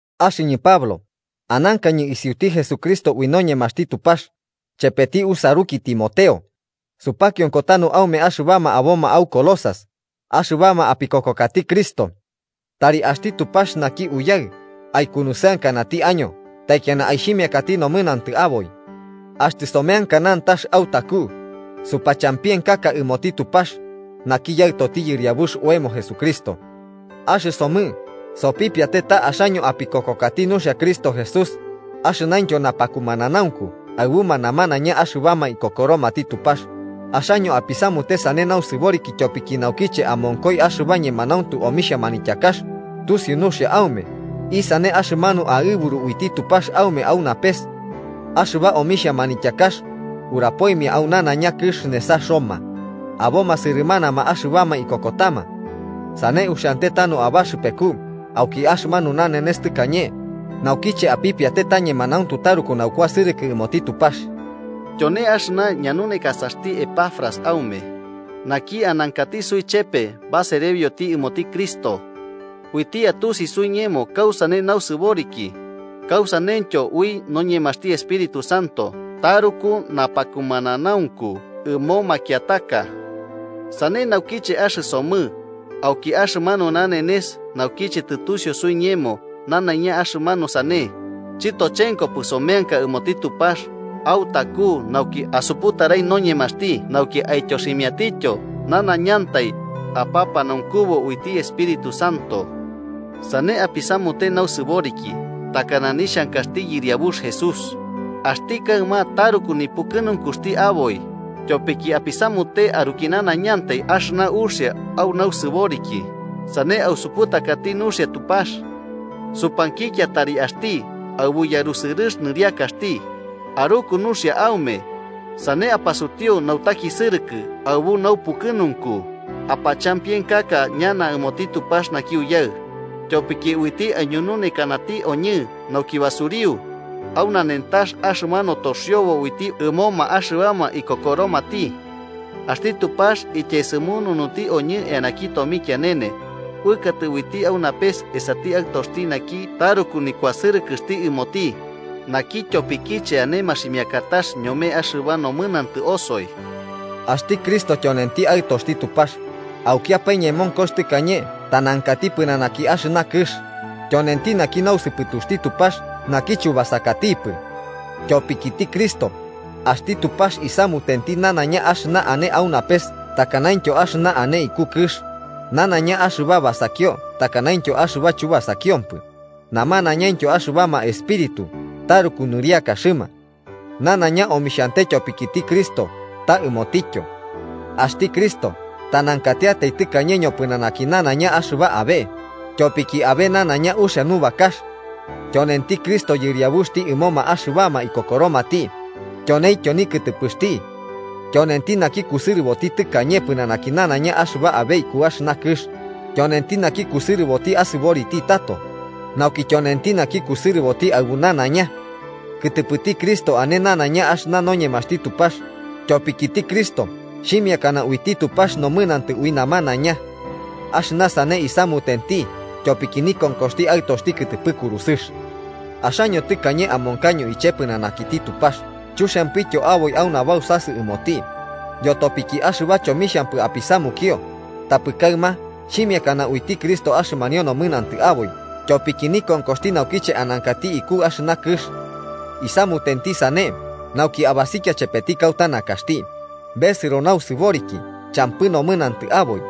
Axɨñɨ Pablo, anankañɨ isiuti Jesucristo ui noñemaxti Tupax, chepeti usaruki Timoteo, supakionko tanu aume axɨbama aboma au Colosas, axɨbama apikokokati Cristo. Tari axti Tupax naki Uyaɨ aikunusɨankanati año taikiana aixhimiakati nomɨnantɨ aboi. Axtɨ someanka nantax autaku supachampienkaka ɨmoti Tupax, naki Yaɨtoti Yɨriabux oemo Jesucristo. Axɨsomɨ sopipiate ta axaño apikokokati nuxia Cristo Jesús axɨnaintyo napakumananaunku aɨbuma namanaiña axɨbama ikokoromati Tupax, axaño apisamute sane nausɨboriki tyopiki, naukiche amonkoi axɨba ñemanauntu omixhia manityakax, tusiu nuxia aume isane axɨmanu aɨburu uiti Tupax aume au napes. Axɨba omixhia manityakax urapoimia au nanaiña kɨx nesa Roma, aboma sɨrɨmanama axɨbama ikokotama. Sane uxiante tanu abaxɨpeku auki axɨmanu nanenes tɨkañe naukiche apipiate ta ñemanauntu taruku naukuasɨrɨkɨ ɨmoti Tupax. Tyone axɨna ñanaunekasaxti Epafras aume, naki anankati suichepe baserebioti ɨmoti Cristo. Uiti atusi suiñemo kausane nausɨboriki, kausaneityo ui noñemaxti Espíritu Santo taruku napakumananaunku ɨmo makiataka. Sane naukiche axɨsomɨ, auki axɨmanu nanenes naukiche tɨtusiu suiñemo nanaiña axɨmanu sane, chɨtochenkopɨ someanka ɨmoti Tupax autaku nauki asuputarai noñemaxti nauki aityoximiatityo nanaiñantai apapanaunkubu uiti Espíritu Santo. Sane apisamute nausɨboriki takana nixhankaxti Yɨriabux Jesús, axti kaɨma taruku nipukɨnunkuxti aboi tyopiki apisamute aruki nanaiñantai axɨna uxia au nausɨboriki sane ausuputakati nuxia Tupax. Supankikia tari axti, aɨbu yarusɨrɨx nɨriakaxti, aruku nuxia aume, sane apasutiu nautakisɨrɨkɨ aɨbu naupukɨnunku apachampienkaka ñana ɨmoti Tupax naki Uyaɨ, tyopiki uiti aiñununekanati oñɨ nauki basuriu, au nanentax axɨmanu toxiobo uiti ɨmoma axɨbama ikokoromati. Axti Tupax ityaesɨmununuti oñɨ eanaki tomikianene, uɨkatɨ uiti au napes esati Aɨtoxti naki taruku nikuasɨrɨkɨxti ɨmoti, naki tyopikiche ane maximiakatax ñome axɨba nomɨnantɨ osoi. Axti Cristo tyonenti Aɨtoxti Tupax, aukiapae ñemonkox tɨkañe tanankati pɨnanaki axɨna kɨx. Tyonenti naki nausɨpɨtuxti Tupax naki chubasakatipɨ. Tyopikiti Cristo, axti Tupax isamutenti nanaiña axɨna ane au napes takanaintyo axɨna ane iku kɨx, nanaiña axɨba basakio takanaintyo axɨba chubasakiompɨ, namanañaintyo axɨbama espíritu taruku nɨriakaxɨma. Nanaiña omixhante tyopikiti Cristo ta ɨmotityo. Axti Cristo tanankatiatai tɨkañe ñopɨnanaki nanaiña axɨba abe, tyopikiti abe nanaiña uxia nubakax. Tyonenti Cristo Yɨriabuxti ɨmoma axɨbama ikokoromati, tyoneintyo nikɨtɨpɨxti. Tyonenti naki kusɨrɨboti tɨkañe pɨnanaki nanaiña axɨba abe iku axɨna kɨx, tyonenti naki kusɨrɨboti asɨboriti tato, nauki tyonenti naki kusɨrɨboti aɨbu nanaiña. Kɨtɨpɨti Cristo ane nanaiña axɨna noñemaxti Tupax, tyopikiti Cristo xhimiakana uiti Tupax nomɨnantɨ ui namanaiña. Axɨna sane isamutenti tyopiki nikonkoxti Aɨtoxti kɨtɨpɨ kurusɨx. Axaño tɨkañe amonkaño iche pɨnanakiti Tupax chuxiampityo aboi au nabausasɨ ɨmoti, yotopiki axɨba chomixhampɨ apisamukio, tapɨ kaɨma xhimiakana uiti Cristo axɨmanio nomɨnantɨ aboi tyopiki nikonkoxti naukiche anankati iku axɨna kɨx. Isamutenti sane nauki abasikia chepeti kauta nakaxti, besɨro nausɨboriki champɨ nomɨnantɨ aboi.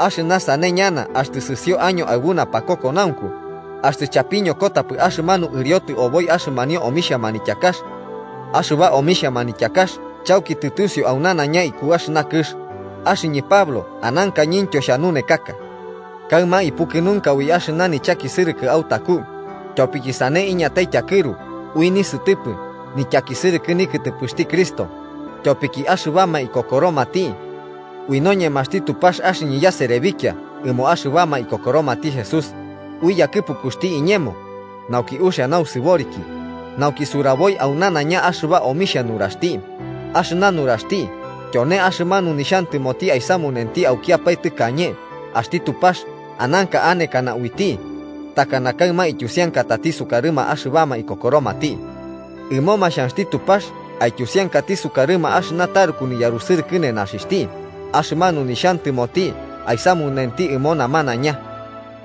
Axɨna sane ñana axtɨ sɨsio año aɨbu napakokonaunku, axtɨ chapiñokotapɨ axɨmanu ɨriotɨ oboi axɨmanio omixhia manityakax. Axɨba omixhia manityakax chauki tɨtusiu au nanaiña iku axɨna kɨx, axɨñɨ Pablo anankañɨntyo xhanunekaka. Kaɨma ipukɨnunka ui axɨna nichakisɨrɨkɨ autaku, tyopiki sane iñatai tyakɨru ui nisɨtɨpɨ nityakisɨrɨkɨ nikɨtɨpɨxti Cristo, tyopiki axɨbama ikokoromati. Ui noñemaxti Tupax axɨñɨ yaserebikia ɨmo axɨbama ikokoromati Jesús, ui yakɨpukuxti iñemo, nauki uxia nausɨboriki, nauki suraboi au nanaiña axɨba omixhia nuraxti, axɨna nuraxti tyone axɨmanu nixhantɨmoti aisamunenti aukiapae tɨkañe axti Tupax ananka anekana uiti, ta kaɨma ityusiankatati sukarɨma axɨbama ikokoromati. Ɨmoma xhanxti Tupax aityusiankati sukarɨma axɨna taruku niyarusɨrɨkɨ nenaxixhti axɨmanu nixhantɨmoti aisamunenti ɨmo namanaiña.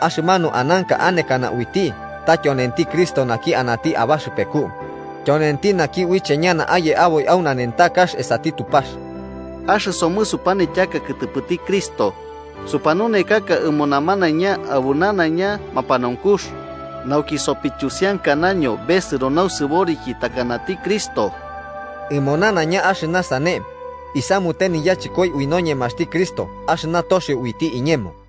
Axɨmanu ananka anekana uiti ta tyonenti Cristo naki anati abaxɨpeku, tyonenti naki uiche ñana aye aboi au nanentakax esati Tupax. Axɨsomɨ supanityaka kɨtɨpɨti Cristo, supanunekaka ɨmo namanaiña aɨbu nanaiña mapanaunkux, nauki sopityusiankanaño besɨro nausɨboriki takanati Cristo. Ɨmo nanaiña axɨna sane isamute niyachɨkoi ui noñemaxti Cristo axɨna toxio uiti iñemo.